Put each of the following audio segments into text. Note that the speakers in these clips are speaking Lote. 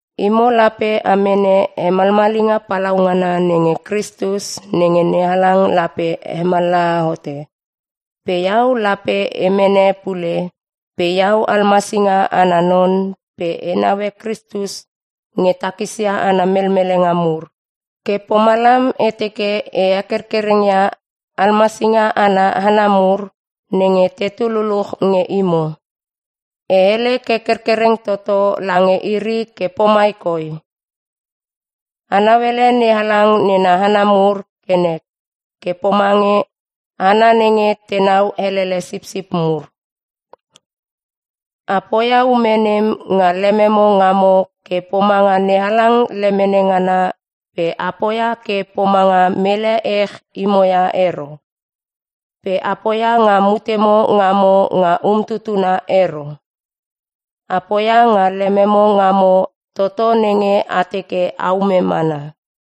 Imo lape a mene hemalmalinga palaungana nenge Kristus nenge NeHalang lape hemallaha hote, pe iau lape e mene pule pe iau almasinga ana non pe e naue Kristus nge takisia ana melmelenga mur. Ke pomalam e teke e hekerkereng ia almasinga ana hana mur nenge tetu luluch nge imo. E hele ke kerkereng toto lange iri ke pomai koi: A nauele NeHalang nena hana mur ke nek ke pomange hana nenge tenau elele sipsip mur. A poia ume nem nga lememo ngamo ke pomanga NeHalang lemene ngana pe a poia ke pomanga mele ech imo ia ero. Pe a poia nga mutemo ngamo nga umtutuna ero, a poia nga lememo ngamo toto nenge a teke aume mana.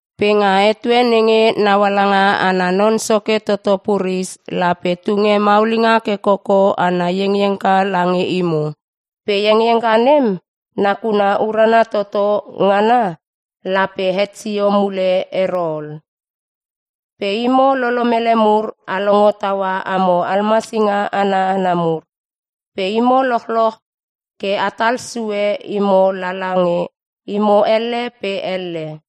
Pe nga etue nenge Naualanga Ana Non Nenge Soke Toto puris, lape tunge maulinga ke koko ana iengiengka lange imo. Pe iengiengka nem nakuna urana toto ngana lape het sio mule ero ol. Pe imo lolomele mur a longo taua amo almasinga ana hana mur, pe imo lochloch ke atal sue imo lala nge imo elle pe elle.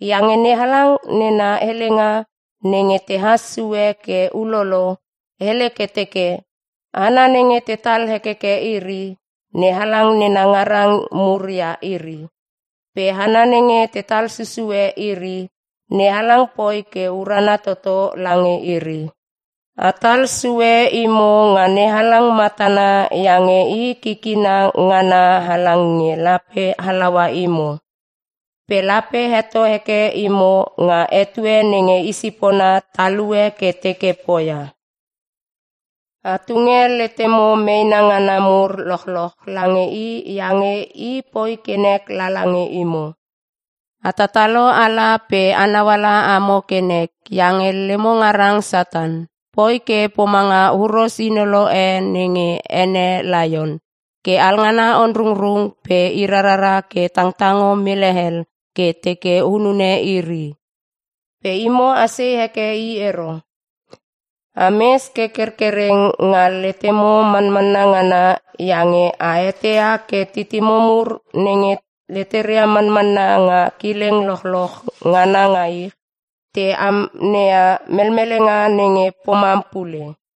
Iange NeHalang nena helenga nenge tehas sue ke ulolo, hele ke teke, “Hana nenge tetal hekeke iri, NeHalang nena ngarang mur ia iri. Pe hana nenge tetal susue iri, NeHalang poi ke urana toto lange iri.” Atal sue imo nga NeHalang matana iange i kikina ngana halang nge lape halaua imo, pe lape heto heke imo nga etue nenge isipona talue ke teke poia. A tunge letemo meena ngana mur lochloch lange i iange i poi ke nek lala nge imo. A tatalo ala pe anau ala amo ke nek iange lemo ngarang Satan, poi ke pomanga huros inolo e nenge ene laion ke alngana onrungrung pe i rarara ke tangtango mele hel ke teke hunune iri. Pe imo asei heke i ero, ames ke kerkereng nga letemo manmanna ngana iange a eteia ke titimo mur nenge leteria manmanna nga kileng lochloch ngana nga ich, te amneia melmelenga nenge pomam pule.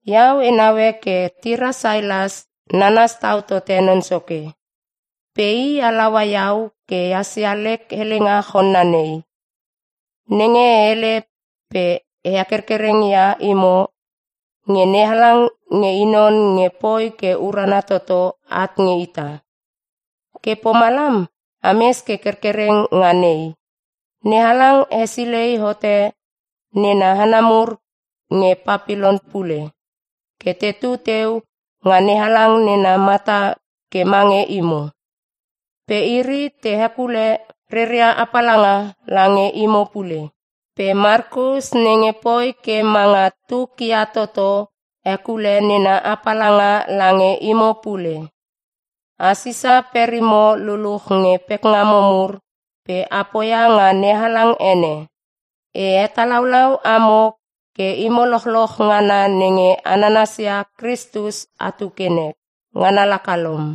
Iau e naue ke tira Sailas nanas tau tote Non Soke. Pe i halaua iau ke hasia lek helenga chonna nei, nenge e hele pe e hekerkereng ia imo nge NeHalang nge i non nge poi ke urana toto at nge ita. Ke pomalam ames ke kerkereng nga nei. NeHalang hesilei hote nena hana mur nge Papilon (Rom) pule ke tetu teu nga NeHalang nena mata ke mange imo. Pe iri te hekule reria apalanga lange imo pule. Pe Makus nenge poi ke manga tuk ia toto hekule nena apalanga lange imo pule. A sisa perimo luluch nge pekngamo mur pe a poia nga NeHalang ene. E hetalaulau amo ke imo lochloch ngana nenge a nanasia Kristus atu ke nek. Ngana laka lom.